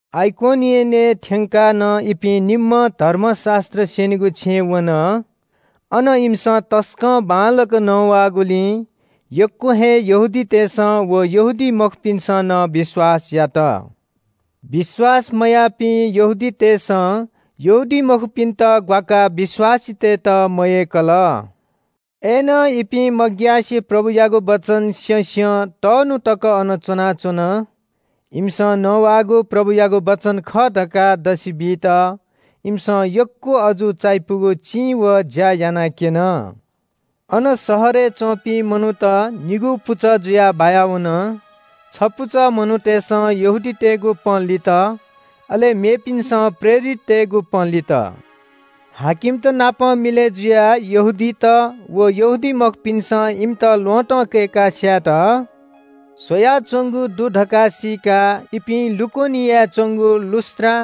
आइकोनियनय् थ्‍यंकाः नं इपिं निम्‍हं धर्मशास्‍त्र स्‍यनीगु छेँय् वन। अन इमिसं तसकं बांलाक नवाःगुलिं यक्‍व हे यहूदीतय्‌सं व यहूदीमखुपिन्‍सं नं विश्‍वास यात। विश्‍वास मयाःपिं यहूदीतय्‌सं यहूदीमखुपिन्‍त ग्‍वाकाः विश्‍वासीतय्‌त मयय्‌कल। अय्‌नं इपिं मग्‍यासे प्रभुयागु वचन स्‍यँस्‍यं तःन्‍हु तक अन च्‍वनाच्‍वन। इमिसं नवाःगु प्रभुयागु वचन खः धकाः दसि बीत इमिसं यक्‍व अजू चायापुगु चिं व ज्‍या यानाक्‍यन। अन शहरय् च्‍वंपिं मनूत निगू पुचः जुयाः बाया वन। छपुचः मनूतय्‌सं यहूदीतय्‌गु पँ लित, अले मेपिन्‍सं प्रेरिततय्‌गु पँ लित। हाकिमत नाप मिलय् जुयाः यहूदीत व यहूदीमखुपिन्‍सं इमित ल्‍वहँतं कय्‌काः स्‍यायेत स्‍वयाच्‍वंगु दु धकाः सीकाः इपिं लुकोनियाय् च्‍वंगु लुस्‍त्रा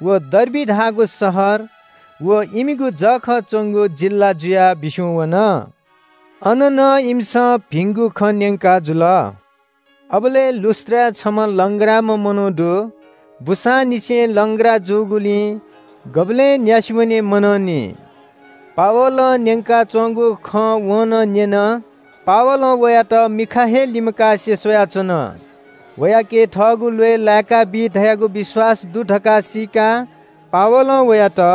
व डर्बी धाःगु शहर व इमिगु जःखः च्‍वंगु जिल्‍ला जुयाः बिस्‍युं वन। अन नं इमिसं भिंगु खँ न्‍यंकाजुल। अबलय् लुस्‍त्राय् छम्‍ह लंग्राम्‍ह मनू दु। बूसांनिसें लंग्रा जूगुलिं गुबलें न्‍यासि वने मनंनि। पावलं न्‍यंकाच्‍वंगु खँ वं नं न्‍यन। पावलं वयात मिखा हे लिमकासे स्‍वयाच्‍वन। वयाके थःगु ल्‍वय् लाय्‌काबी धयागु विश्‍वास दु धकाः सीकाः पावलं वयात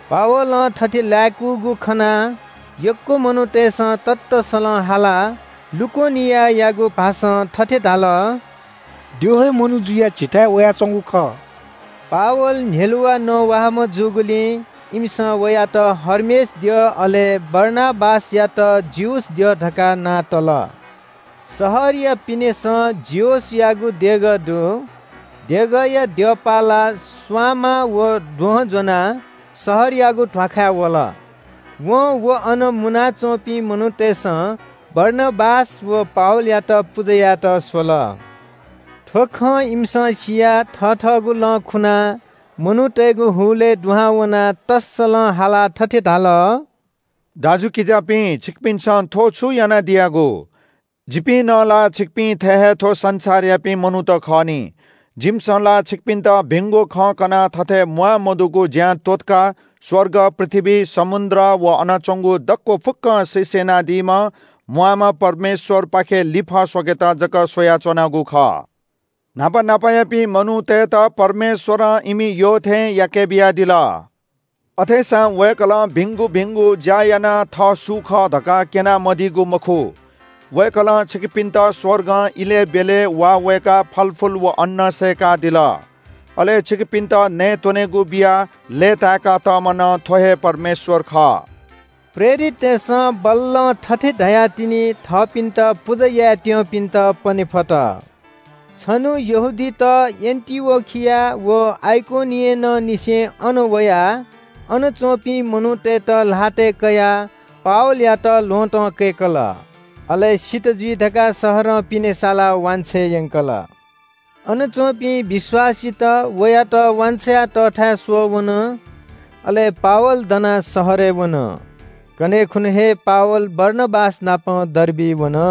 पावलं थथे लाय्‌कूगु खनाः यक्‍व मनूतय्‌सं ततःसलं हालाः लुकोनियायागु भाषां थथे धाल – “द्यः हे मनू जुयाः झीथाय् वयाच्‍वंगु खः।” पावल न्‍ह्यलुवाः नवाःम्‍ह जूगुलिं इमिसं वयात हर्मेस द्यः अले बारनाबासयात जिउस द्यः धकाः नां तल। शहरया पिनेसं जिउसयागु देगः दु। देगःया द्यःपाःलाः स्‍वांमाः व द्वहं ज्‍वनाः शहरयागु ध्‍वाखाय् वल। वं व अन मुनाच्‍वंपिं मनूतय्‌सं बारनाबास व पावलयात पुजा यायेत स्‍वल। थ्‍व खँ इमिसं सियाः थथःगु लं खुनाः मनूतय्‌गु हुलय् दुहां वनाः तःसलं हालाः थथे धाल – “दाजुकिजापिं, छिकपिन्‍सं थ्‍व छु यानादियागु? जिपिं नं ला छिकपिं थें हे थ्‍व संसारयापिं मनूत खः नि। जिमिसं ला छिकपिन्‍त भिंगु खँ कनाः थथे म्‍वाःमदुगु ज्‍यां त्‍वःतकाः स्‍वर्ग, पृथ्‍वी, समुद्र व अन च्‍वंगु दक्‍व फुक्‍कं सृष्‍टि यानादीम्‍ह म्‍वाःम्‍ह परमेश्‍वरपाखे लिफः स्‍वकेत जक स्‍वयाच्‍वनागु खः। न्‍हापा न्‍हापायापिं मनूतय्‌त परमेश्‍वरं इमि यःथें याकेबियादिल। अथेसां वय्‌कलं भिंगु भिंगु ज्‍या यानाः थः सु खः धकाः क्‍यना मदीगु मखु। वय्‌कलं छिकपिन्‍त स्‍वर्गं इलय् ब्‍यलय् वा वय्‌काः फलफुल व अन्‍न सय्‌कादिल। अले छिकपिन्‍त नयेत्‍वनेगु बियाः लय्‌ताय्‌का तःम्‍ह नं थ्‍व हे परमेश्‍वर खः।” प्रेरिततय्‌सं बल्‍लं थथे धयाःतिनि थःपिन्‍त पुजा यायेत्‍यंपिन्‍त पने फत। छन्‍हु यहूदीत एन्‍टिओखिया व आइकोनियनंनिसें अन वयाः अन च्‍वंपिं मनूतय्‌त ल्‍हातय् कयाः पावलयात ल्‍वहँतं कय्‌कल। अले सित जुइ धकाः शहरं पिने सालाः वांछ्वये यंकल। अन च्‍वंपिं विश्‍वासीत वयात वान्‍छ्वया तःथाय् स्‍वःवन। अले पावल दनाः शहरय् वन। कन्‍हय् खुन्‍हु हे पावल बारनाबास नाप डर्बिइ वन।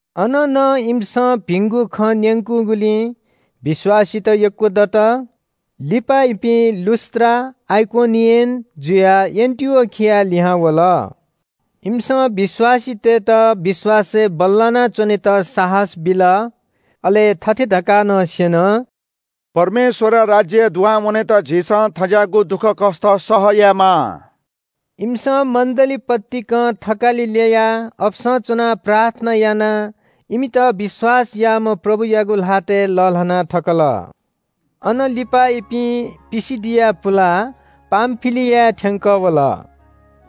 अन नं इमिसं भिंगु खँ न्‍यंकूगुलिं विश्‍वासीत यक्‍व दत। लिपा इपिं लुस्‍त्रा, आइकोनियन जुयाः एन्‍टिओखियाय् लिहां वल। इमिसं विश्‍वासीतय्‌त विश्‍वासय् बल्‍लाना च्‍वनेत साहस बिल। अले थथे धकाः नं स्‍यन – “परमेश्‍वरया राज्‍यय् दुहां वनेत झीसं थज्‍याःगु दुःखकष्‍ट सह यायेमाः।” इमिसं मण्‍डली पतिकं थकालि ल्‍ययाः अपसं च्‍वनाः प्रार्थना यानाः इमित विश्‍वास याःम्‍ह प्रभुयागु ल्‍हातय् लःल्‍हाना थकल। अन लिपा इपिं पिसिदिया पुलाः पामफिलियाय् थ्‍यंकः वल।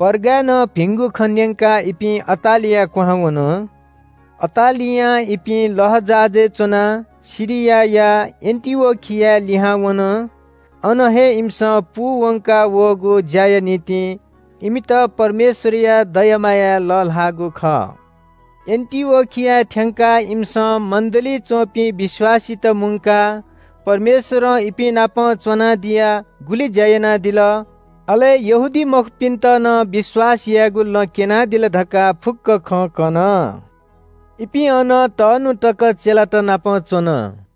पर्गाय् नं भिंगु खँ न्‍यंकाः इपिं अटालिया क्‍वहां वन। अटालियां इपिं लःजहाजय् च्‍वनाः सिरियाया एन्‍टिओखियाय् लिहां वन। अन हे इमिसं पूवंका वःगु ज्‍याया निंतिं इमित परमेश्‍वरया दया मायाय् लःल्‍हाःगु खः। एन्‍टिओखियाय् थ्‍यंकाः इमिसं मण्‍डलीइ च्‍वंपिं विश्‍वासीत मुंकाः परमेश्‍वरं इपिं नाप च्‍वनादियाः गुलि ज्‍या यानादिल, अले यहूदीमखुपिन्‍त नं विश्‍वास यायेगु लँ क्‍यनादिल धकाः फुक्‍क खँ कन। इपिं अन तःन्‍हु तक चेलातनापं च्‍वन।